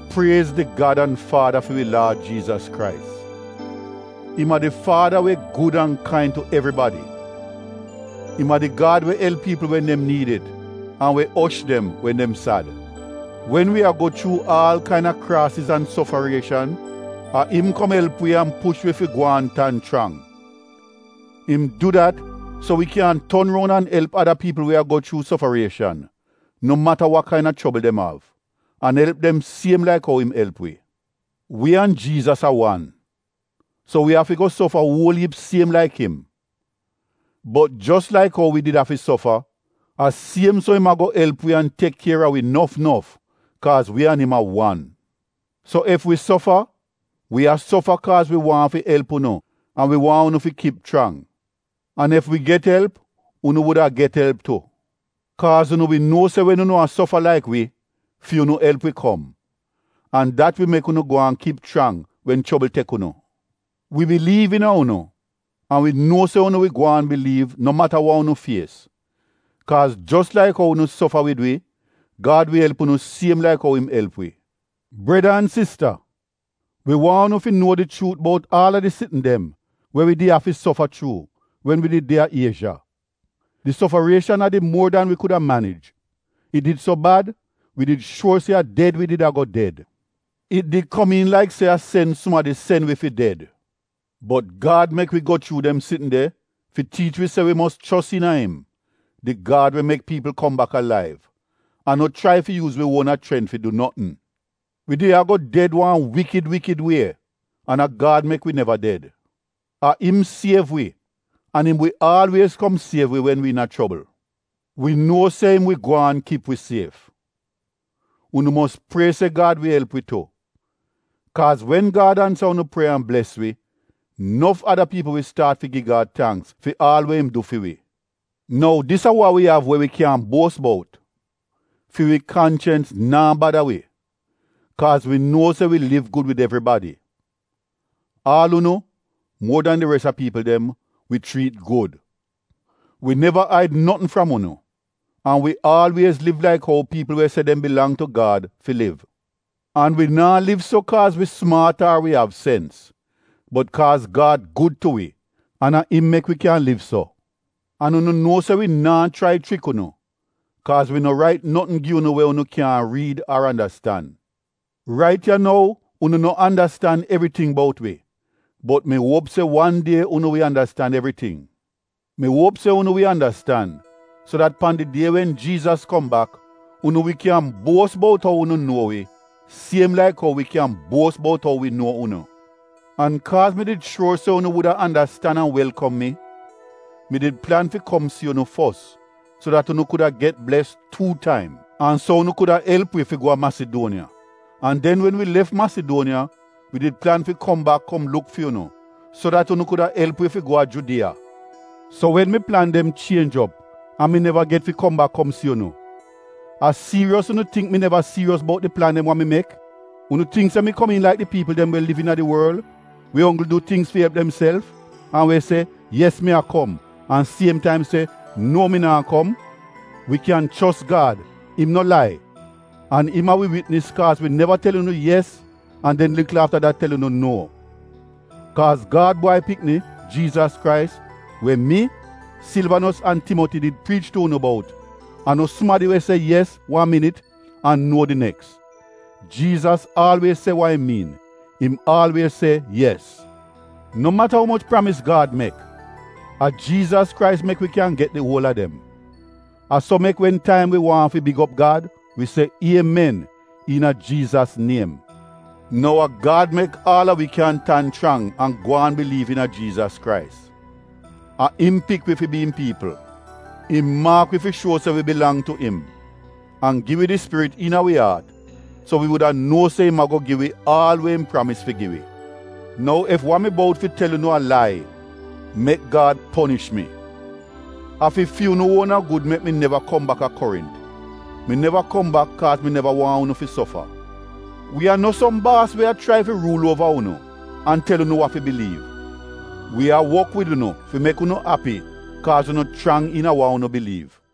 Priez di Gad an Faada fi wi Laad Jiizas Krais. Im a di Faada we gud an kain tu evribadi. Im a di Gad we elp piipl wen dem niid it an we osh dem wen dem sad. Wen wi a go chuu aal kaina kraasiz an sofarieshan, a im kom elp wi an push wi fi gwaan tan chrang. Im du dat so wi kyan ton roun an elp ada piipl we a go chuu sofarieshan, no mata wa kaina chobl dem av, an elp dem siem laik ou im elp wi. Wi an Jiizas a wan, so wi afi go sofa uol iip siem laik im. Bot jos laik ou wi did afi sofa, a siem so im ago elp wi an tek kier a wi nof nof kaaz wi an im a wan. So ef wi sofa, wi a sofa kaaz wi waahn fi elp unu an wi waahn unu fi kip chrang. An ef wi get elp, unu wuda a get elp tu. Kaaz unu wi nuo se wen unu a sofa laik wi, fi unu elp wi kom. An dat wi mek unu gwaan kip chrang wen chobl tek unu. Wi biliiv iina unu an wi nuo se unu wi gwaan biliiv no mata wa unu fies kaaz jos laik ou unu sofa wid wi, Gad wi elp unu siem laik ou im elp wi. Breda an sista wi waahn unu fi nuo di chuut bout aal a di sitn dem we wi did afi sofa chuu wen wi did de a Iezha. Di sofarieshan a did muor dan wi kuda manij. It did so bad wi did shuor se a ded wi did a go ded. It did komiin laik se a sen sumadi sen wi fi ded. Bot Gad mek wi go chuu dem sitn de fi tiich wi se wi mos chos iina im, di Gad we mek piipl kom bak alaiv, an no chrai fi yuuz wi uona chrent fi du notn. Wi did a go ded wan wikid wikid wie an a Gad mek wi neva ded. A im siev wi an im wi aalwiez kom siev wi wen wi iina chobl. Wi nuo se im wi gwaan kip wi sief. Unu mos prie se Gad wi elp wi tu. Kaaz wen Gad ansa unu prieya an bles wi, nof ada piipl wi staat fi gi Gad tangks fi aal we im du fi wi. Nou dis a wa wi av we wi kyan buos bout: fi wi kanchens naa bada wi, kaaz wi nuo se wi liv gud wid evribadi. Aal unu, muor dan di res a piipl dem, wi chriit gud. Wi neva aid notn fram unu an wi aalwiez liv laik ou piipl we se dem bilang tu Gad fi liv. An wi naa liv so kaaz wi sumaat ar wi av sens, bot kaaz Gad gud tu wi an a im mek wi kyan liv so. An unu nuo se wi naa chrai chrik unu kaaz wi no rait notn gi unu we unu kyaahn riid ar andastan. Rait ya nou unu no andastan evriting bout wi bot mi uop se wan die unu wi andastan evriting. Mi uop se unu wi andastan so dat pan di die wen Jiizas kom bak, unu wi kyan buos bout ou unu nuo wi siem laik ou wi kyan buos bout ou wi nuo unu. An kaaz mi did shuor se unu wuda andastan an welkom mi, mi did plan fi kom si unu fos, so dat unu kuda get bles tuu taim, an so unu kuda elp wi fi go a Masiduoniya. An den wen wi lef Masiduoniya wi did plan fi kom bak kom luk fi unu so dat unu kuda elp wi fi go a Judiya. So wen mi plan dem chienj op an mi neva get fi kom bak kom si unu, a siiriyos unu tingk mi neva siiriyos bout di plan dem wa mi mek? Unu tingk se mi komiin laik di piipl dem we liv iina di wol we onggl du tingz fi elp demself an we se “Yes mi a kom” an siem taim se “No mi naa kom”? Wi kyan chos Gad, im no lai, an im a wi witnis kaaz wi neva tel unu “yes” an den likl afta dat tel unu “nuo.” Kaaz Gad Bwai Pikni, Jiizas Krais, we mi, Silvanos an Timoti did priich tu unu bout, a no sumadi we se “Yes” wan minit an “Nuo” di neks. Jiizas aalwiez se wa im miin, im aalwiez se “Yes.” No mata umoch pramis Gad mek, a Jiizas Krais mek wi kyan get di uol a dem. A so mek wen taim wi waahn fi big op Gad wi se “Iemen” iina Jiizas niem. Nou a Gad mek aal a wi kyan tan chrang an gwaan biliiv iina Jiizas Krais. A im pik wi fi bi im piipl. Im maak wi fi shuo se wi bilang tu im an gi wi di Spirit iina wi aat so wi wuda nuo se im ago gi wi aal we im pramis fi gi wi. Nou ef wa mi bout fi tel unu a lai, mek Gad ponish mi: a fi fi unu uona gud mek mi neva kom bak a Korint. Mi neva kom bak kaaz mi neva waahn unu fi sofa. Wi a no som baas we a chrai fi ruul uova unu an tel unu wa fi biliiv. Wi a wok wid unu fi mek unu api kaaz unu chrang iina wa unu biliiv.